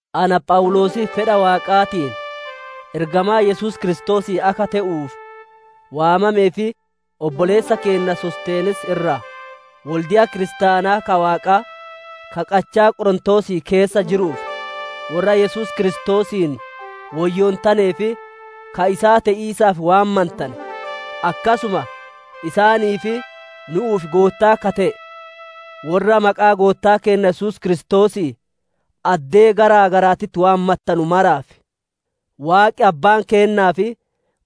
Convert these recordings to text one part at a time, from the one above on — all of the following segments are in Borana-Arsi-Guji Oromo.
Ana Phawuloosii fedha Waaqaatiin ergamaa Yesuus Kiristoosii akka te'uuf waamamee fi obboleessa keenna Sostenees irraa: Wolde'a kiristaanaa ka Waaqaa ka qachaa Qorontoosii keessa jiruuf, worra Yesuus Kiristoosiin woyyoontanee fi ka isaa te'iisaaf waamantane, akkasuma isaanii fi nu'uuf Goottaa ka te'e, worra maqaa Goottaa keenna Yesuus Kiristoosii addee gara garaatitti waammattanu maraaf: Waaqi Abbaan keennaa fi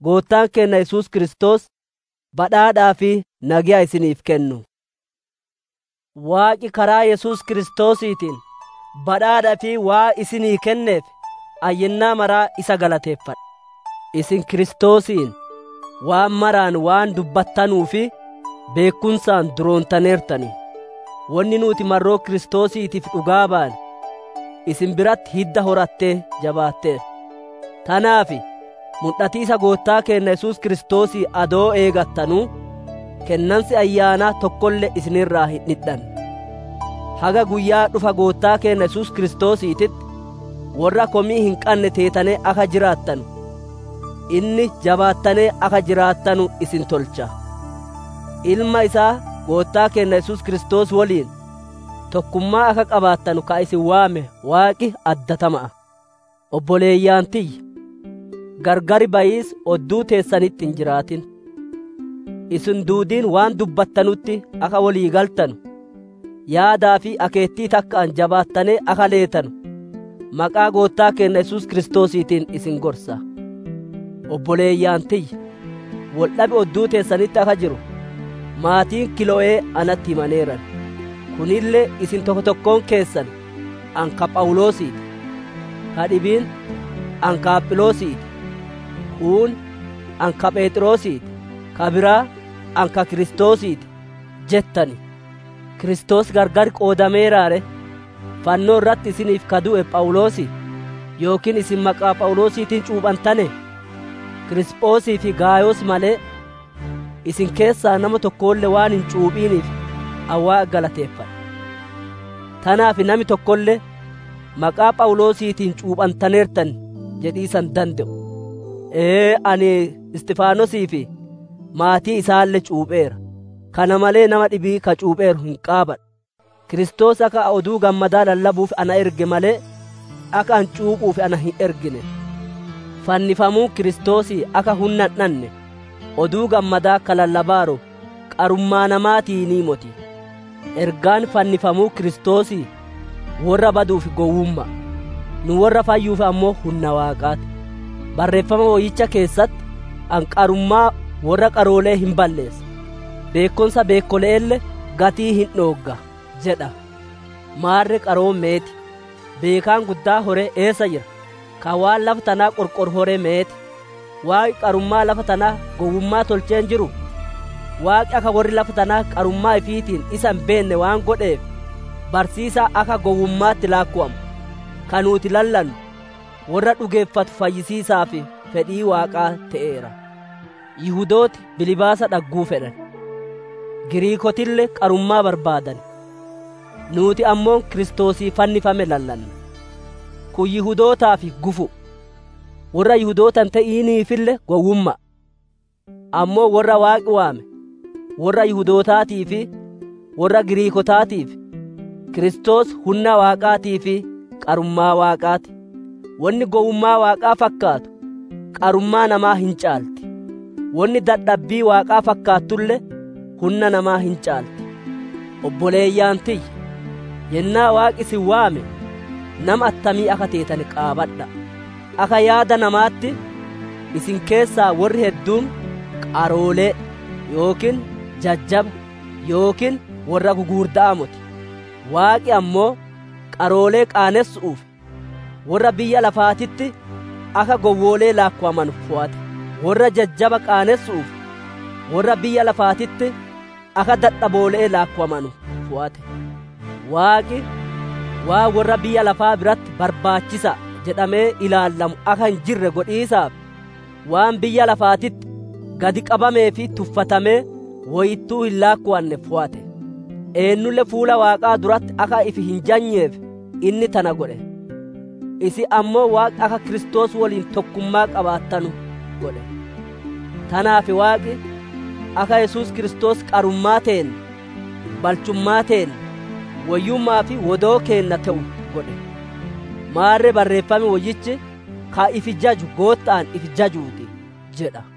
Goottaan keenna Yesuus Kiristoos badhaadhaa fi nageya isiniif kennu. Waaqi karaa Yesuus Kiristoosiitiin badhaadha ifii waan isinii kenneef ani yennaa maraa isa galateeffadha. Isin Kiristoosiin waan maraan waan dubbattanuu fi beekkumsaan duroontaneertan. Wonni nuuti marroo Kiristoosiitiif dhugaa baane, isin biratti hidda horattee jabaatteerti. Tanaaf mudhatiisa Goottaa keenna Yesuus Kiristoosii adoo eeggattanuu, Kennansi Ayyaanaa tokkolle isin irraa hin dhidhanne. Haga guyyaa dhufa Goottaa keenna Yesuus Kiristoosiititti worra komii hin qanne teetanee akka jiraattanu, inni jabaattanee akka jiraattanu isin tolcha. Ilma isaa Goottaa keenna Yesuus Kiristoos woliin, tokkummaa akka qabaattanu ka isin waame Waaqi addatama'a. Obboleeyyan tiyya, gargar bayiisi odduu teessanitti hin jiraatin; isin duudiin waan dubbattanutti akka wolii galtanu, yaadaa fi akeettii takka'aan jabaattanee akka leetanu maqaa Goottaa keenna Yesuus Kiristoosiitiin isin gorsa. Obboleeyyan tiyya, wol dhabi odduu teessanitti akka jiru, maatiin Kilo'ee natti himaneeran. Kunille isin tokkoon tokkoon keessan, «Ani ka Phawuloosii ti»; ka dhibiin, «Ani ka Apholoosii ti»; kuun, «Ani ka Pheexroosii ti»; ka biraa, «Ani ka Kiristoosii ti» jettan. Kiristoos gargar qoodameeraa ree? Fannoo irratti isiniif ka du'e Phawuloosii? Yookiin isin maqaa Phawuloosiitiin cuuphantanee? Kiriisphosii fi Gaayos malee, isin keessaa nama tokkolle waan hin cuuphiniif ani Waaqa galateeffadha. Tanaaf nami tokkolle, «Maqaa Phawuloosiitiin cuuphantaneertan» jedhiisa hin dande'u. Ee, ani Isxifaanosii fi maatii isaalle cuupheera; kana malee nama dhibii ka cuupheeru hin qaabadhu. Kiristoos akka ani Oduu Gammadaa lallabuuf ana erge malee, akka cuuphuuf na hin ergine. Fannifamuun Kiristoosii akka hunna hin dhanne, Oduu Gammadaa ka lallabaaru qarummaa namaatiinii moti. Ergaan fannifamuu Kiristoosii worra baduuf gowwumma'a; nu worra fayyuuf ammoo hunna Waaqaa ti. Barreeffama Woyyicha keessatti, «Ani qarummaa worra qaroole'ee hin balleessa; beekkumsa beekkole'eelle gatii hin dhoogga» jedha. Maarre qaroon meet? Beekaan guddaan hore eessa jira? Ka waan lafa tanaa qorqoru hore meet? Waaqi qarummaa lafa tanaa gowwummaa tolchee hin jiruu? Waaqi akka worri lafa tanaa qarummaa ifiitiin isa hin beenne waan godheef, barsiisa akka gowwumma'aatitti laakkowamu ka nuuti lallannu worra dhugeeffatu fayyisiisaaf fedhii Waaqaa te'eera. Yihudooti bilbaasa dhagguu fedhan, Giriikootille qarummaa barbaadan. Nuuti ammoo Kiristoosii fannifame lallanna. Kun Yihudootaaf gufu'uu, worra Yihudoota hin te'iniifille gowwumma'a. Ammoo worra Waaqi waame, worra Yihudootaatii fi worra Giriikootaatiif Kiristoos hunna Waaqaatii fi qarummaa Waaqaa ti. Wonni gowwummaa Waaqaa fakkaattu qarummaa namaa hin caalti; wonni dadhabbii Waaqaa fakkaattulle hunna nama hin caalti. Obboleeyyan tiyya, yennaa Waaqi isin waame nama attamii akka teetane qaabadha'a. Akka yaada namaatitti isin keessaa worri hedduun qaroolee, yookiin jajjaba, yookiin worra gugurda'aa moti. Waaqi ammoo qaroolee qaanessu'uuf, worra biyya lafaatitti akka gowwoole'ee laakkowamanu fowate; worra jajjaba qaanessu'uuf worra biyya lafaatitti akka dadhaboole'ee laakkowamanu fowate. Waaqi, waan worra biyya lafaa biratti barbaachisa'a jedhamee ilaallamu akka hin jirre godhiisaaf, waan biyya lafaatitti gadi qabamee fi tuffatamee, woyittuu hin laakkowanne fowate. Eennulle fuula Waaqaa duratti akka ifi hin jajneef inni tana godhe. Isin ammoo Waaqi akka Kiristoos woliin tokkummaa qabaattanu godhe. Tanaaf Waaqi, akka Yesuus Kiristoos qarummaa teenna, balchummaa teenna, woyyumma'aa fi wodoo keenna te'u godhe. Maarre Barreeffam Woyyichi, «Ka ifi jaju Gootta'aan ifi jajuu ti» jedha.